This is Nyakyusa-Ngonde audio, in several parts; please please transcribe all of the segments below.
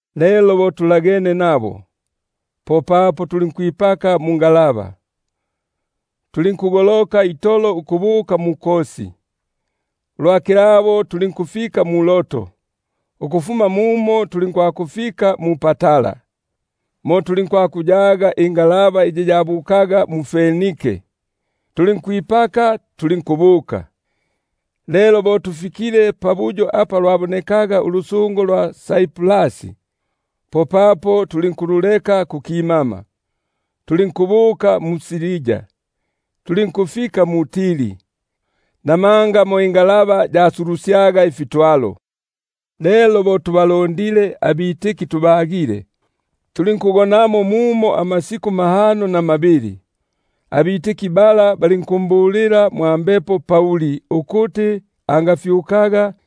Lelo bo twitatwile kumyabo, popapo tulinkwipaka mungalaba, tulinkugoloka itolo ukubuka mu-Ko; ulwa kilabo tulinkufika mu-Rodo, ukufuma mumo tulinkwakufika mu-Patara. Mo tulinkuyaga ingalaba iyi yabukaga mu- Fenike; tulinkwipaka tulinkubuka. Lelo bo lubonike ulusungo lwa Saiprasi, popapo tulinkululekela kukimama, tulinkubuka mu-Siria, tulinkufika mu-Tiri; namanga mo ingalaba yasulusyaga ifitwalo. Lelo bo tubakindile abafundigwa tubagile, tulinkugonamo mumo amasiku mahano na mabili; abene balinkumbulila Pauli mwa Mbepo ukuti angafyukaga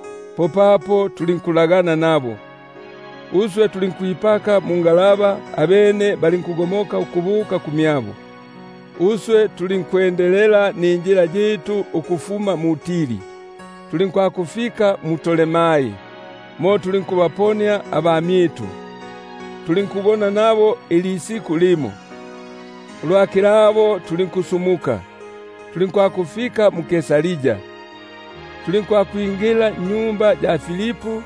Popapo tulinkulagana nabo, uswe tulinkwipaka mungalaba, abene balinkugomoka ukubuka kumyabo. Bo tumalile injila yitu ukufuma mu-Tiri, tulinkwakufika mu-Ptolomai; tulinkubaponia abamyitu, tulinkugona nabo ilisiku limo. Ulwa kilabo tulinkusumuka, tulinkwakufika mu-Kaisaria, tulinkwakwingila nnyumba ya Filipu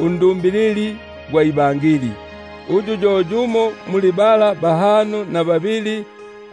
undumbilili gwa Ibangeli, uyu ali yo yumo muli bala bahano na babili;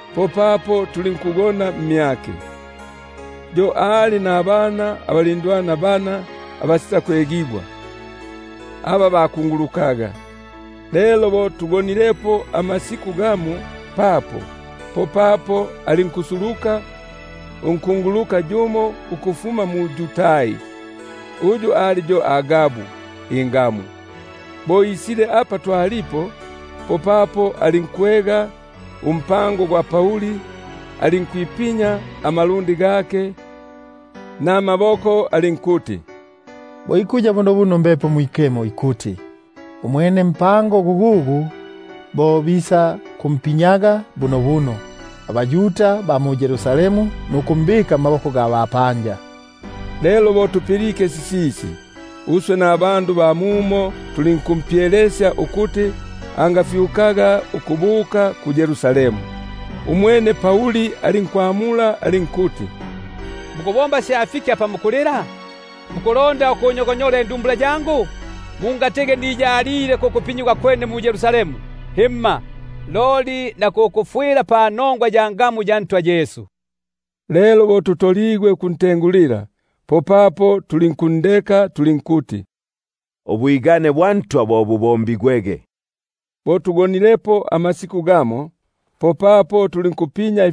popapo tulinkugona mmyake. Yo ali nabana abalindwana bana abasitakwegigwa, aba bakungulukaga. Lelo bo tugonilepo amasiku gamo papo, popapo alinkusuluka unkunguluka yumo ukufuma mu-Yudai, uyu ali yo Agabu ingamu. Bo isile apa twalipo, popapo alinkwega umpango gwa Pauli, alinkwipinya amalundi gake namaboko alinkuti: Bo ikuya bunobuno Mbepo Mwikemo ikuti: Umwenempango gugugu bo bisakumpinyaga bunobuno abaYuda ba mu-Yerusalemu, nukumbika mmaboko ga bapanja. Lelo bo tupilike sisisi, uswe nabandu ba mumo tulinkumpyelesya ukuti angafyukaga ukubuka mu-Yerusalemu. Umwene Pauli alinkwamula alinkuti: Mukubomba sya fiki apa mukulila nukungonyola indumbula yangu? Mungatigi niyalile ku kupinyigwa kwene mu-Yerusalemu, himma, loli na ku kufwila panongwa ya ngamu ya Ntwa Yesu. Lelo bo tutoligwe ukuntengulila, popapo tulinkundeka tulinkuti: Ubwigane bwa Ntwa bo bubombigwege. Lelo bo gakindile amasiku gagaga, popapo tulinkwitende-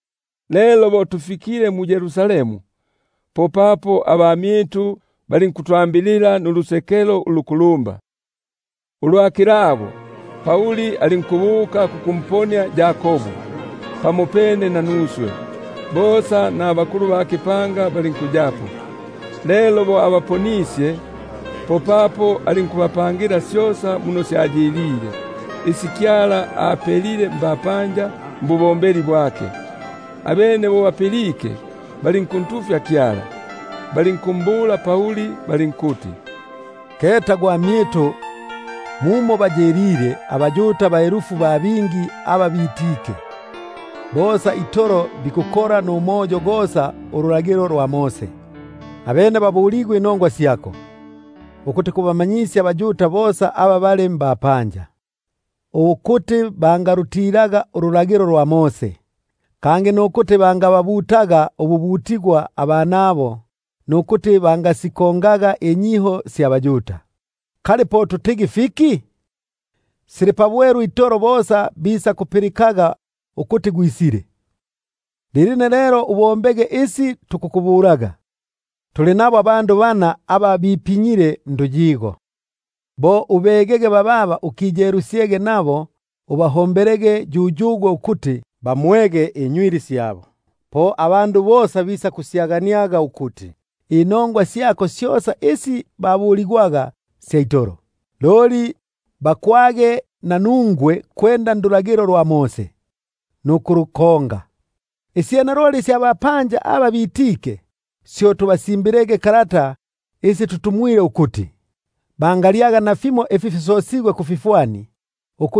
Lelo bo mfikile mu-Yerusalemu, popapo abamyitu balinku- twambilila nulusekelo ulukulumba. Ulwa kilabo, Pauli pamopene nanuswe tulinkubuka kwa Yakobu; bosa nabakulu ba kipanga balinkuyapo. Lelo bo abaponisye, popapo alinkubapangila syosa muno syayilile yimoyimo, isi Kyala apelile mbapanja mbubombeli bwake. Abene bo bapilike, balinkuntufya Kyala, balinkumbula Pauli balinkuti: Keta gwamyitu, muno bayilile abaYuda baelifu ba bingi aba bitike; bosa itolo babikilepo fiyo umoyo palulagilo. Abene babuligwe inongwa syako, ukuti kubamanyisya abaYuda bosa aba bali mbapanja ukundeka Mose, ukuti bangababutangako abanabo, kangi nukusitakusikonga inyiho syabo. Kali po tutigi fiki? Bosa bisakupilikaga ukuti gwisile. Lilino lelo ubombege isi nikukubulaga; tuli nabo abandu bana aba bipinyile nduyiga- niko, bo ubegege bababa ukiyelusyege nabo, ubahombelege yuyugwe ukuti bamwege imitu gyabo; po bosa bisakumanyaga ukuti inongwa syako syosa isi babuligwaga sya itolo; loli bakwage nanungwe ukuti kwenda ndulagilo nukulukonga. Isyene loli isya bapanja aba bitike, syo tubasimbile isi tutumwile ukuti, bepukeko kuli ifi bikemekisye kufifwani, na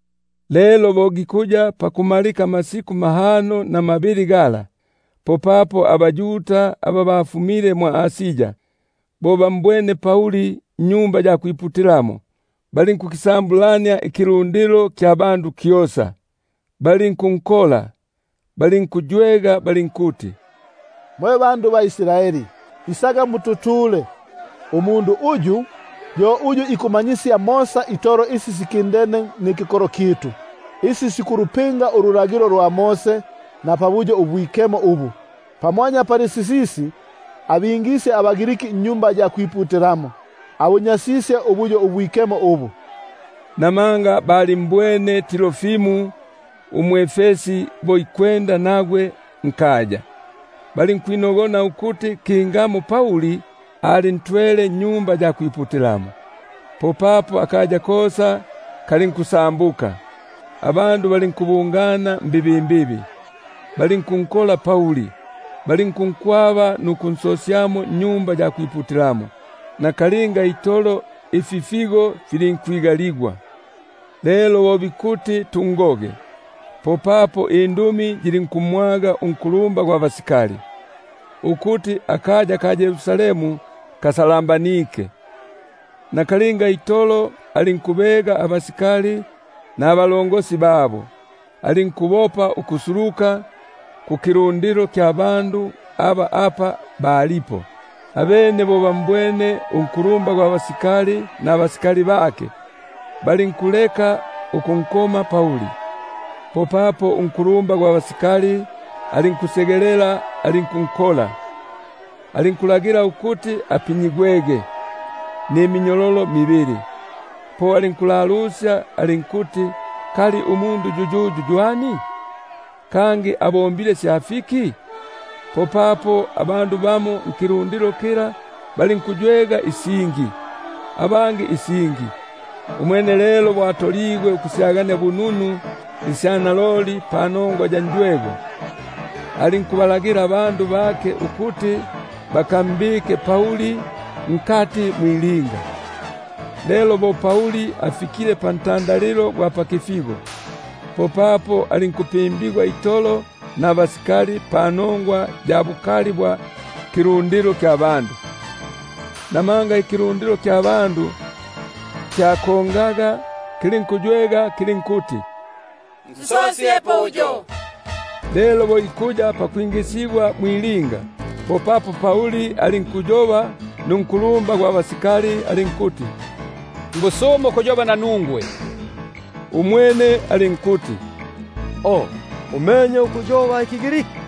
Lelo bo gikuya pakumalika amasiku mahano na mabili gala, popapo abaYuda aba bafumile mwʼAsia, bo bambwene mwa Tempeli, balinkukisambulania ikilundilo kyosa, balinku- nkola, balinkuywega balinkuti: Mwe bandu ba Israeli, isaga mututule; umundu uyu yo uyu ikumanyisya mosa itolo isi sikindene nikikolo kyitu, nululagilo, nubuyo ubu; pamwanya pali sisisi, abingisye abaGriki mwa Tempeli, abunyasisye ubuyo ubwikemo ubu. Namanga balimbwene Trofimo umwʼEfesi bo ikwenda nagwe nkaya, balinkwinogona ukuti kingamo Pauli alintwele mwa Tempeli. Popapo akaya kosa kalinkusambuka, abandu balinkubungana mbibimbibi, balinkunkola Pauli, balinkunkwaba nukunsosyamo mwa Tempeli; nakalinga itolo ififigo filinkwigajigwa. Lelo bo bikuti tungoge, popapo indumi yilinkumwaga unkulumba gwa basikali, ukuti akaya kosa ka Yerusalemu kafulunganike. Nakalinga itolo alinkubega abasikali nabasarjenti bake, alikubopa ukusuluka apa balipo; abene lelo bo bambwene unkulumba gwa basikali nabasikali bake, balinkuleka ukunkoma Pauli. Popapo unkulumba gwa basikali alinkusegelela alinkunkola, alinkulagila ukuti apinyigwege niminyololo mibili; alinkulalusya alinkuti: Kali ywani yuyuyu, kangi abombile sya fiki? Popapo bamo nkilundilo balinkuywega isingi, abangi isingi. Umwene lelo bo atoligwe ukusyagania bununu isya naloli panongwa ya njwego, alinkulagila ukuti bantwalege mwilinga. Lelo bo Pauli afikile pantandalilo gwa pakifigo, popapo alinkupimbigwa itolo nabasikali panongwa ya bukali bwa kilundilo; namanga ikilundilo kya bandu kyakongaga, kilinkuywega kilinkuti: Nsosyepo uyo. Lelo bo ikuya pakwingisigwa mwilinga, popapo Pauli alinkuyoba nunkulumba gwa basikali alinkuti: Natigi njobe nanungwe. Umwene alinkuti: O, umenye ukuyoba ikiGriki?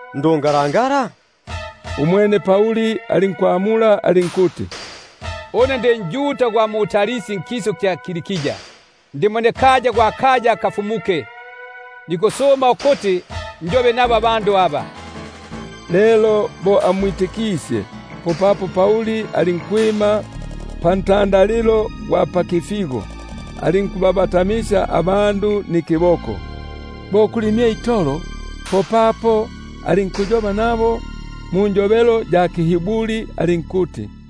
ndungalangala? Umwene Pauli alinkwamula alinkuti: Une ndi njuda gwa mu-Tarsi nkisu kya Kilikia; ndi mwenekaya gwa kaya abafumuke. Nikukusuma ukuti njobe nabo abandu aba. Lelo bo amwitikisye, popapo Pauli alinkwima pantandalilo gwa pakifigo, alinkubabatamisya abandu nikiboko; bo kuli mye itolo, popapo alinkuyoba nabo munjobelo ya kiHiburi alinkuti: